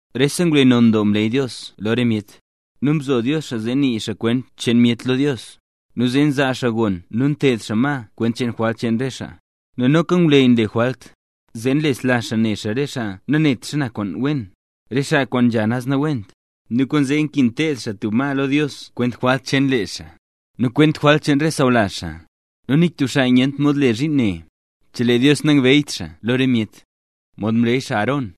Rese ngwleyy non doo mleey Dios lo re myet, nu mzo Dios xaa zee nii xaa kwent cheen myet lo Dios, nu zee nzaa xaa gon nu nteed xaa ma kwent cheen jwalt cheen re xaa. Nel noka ngwleyy nle jwalt, zee nlesla xaa ne xaa re xaa nanet xana kwaan wen, re xaa kwaan nzha naz nawent; nu kwaanzee nkin teed xaa tub ma lo Dios kwent jwalt cheen lee xaa, nu kwent jwalt cheen re sawlazh xaa. Nu nik tub xaa nyent mod le zhiin ne, chelee Dios nangbeeyt xaa lo re myet, mod mleey xaa Aarón.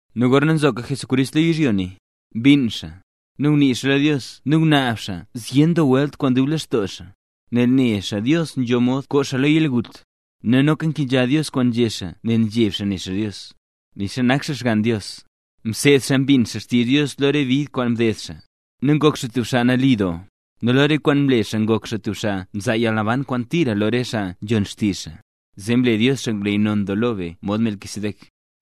Nu gorna nzoka Jesucrist lo yizhyo ne, mbinn xaa, nu ngunii xaa lo Dios nu ngunaab xaa zyen doo welt kwaan dub lextoo xaa, nel nela xaa Dios nzho mod koo xaa lo yalgut, nu noka mkenzha Dios kwaan nzhé xaa nel mzheb xaa ne xaa Dios. Nixa nak xaa Xgann Dios, mseed xaa mbin xaa xtizh Dios lo re bid kwaan mded xaa, nu ngok xaa tub xaa nali doo, nu lo re kwaane mle zee ngok xaa tub xaa nzaa yalnaban kwaan tira lo re xaa nzhon xtizh xaa, zee mle Dios xaa ngwleyy non doo lo be mod Melquisedec.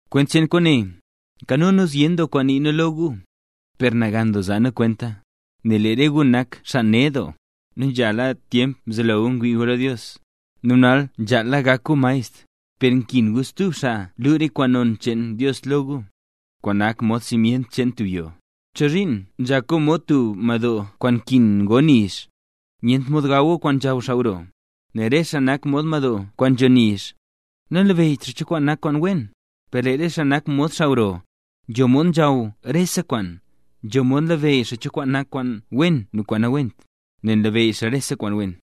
Kwent cheen kwaane, nkano nu zyen doo kwaan nii nu lo gu, per nagan doo zaa nu kwenta, nel lee re gu nak xaa ned doo. Nu nzhala tyemp mzelo gu ngwii gu lo Dios, nu nala nzhaala gak gu maestr, per nkin gu stub naz xaa lu re kwaan non cheen Dios lo gu, kwaan nak mod simyent cheen tub yoo. ¿Chozhiin nzhak gu mod tub madoo kwaan nkin go nizh, nyent mod gaw gu kwaan nzhaw xaa gro? Nel re xaa nak mod madoo kwaan nzho nizh, nanlabeyyt xaa cho kwaan nak kwaan wen. Per lee re xaa nak mod xaa gro, xaa nzho mod nzhaw rese kwaan, nzho mod labeyy xaa cho kwaan nak kwaan wen nu kwaan nawent, nel nlabeyy xaa rese kwaan wen.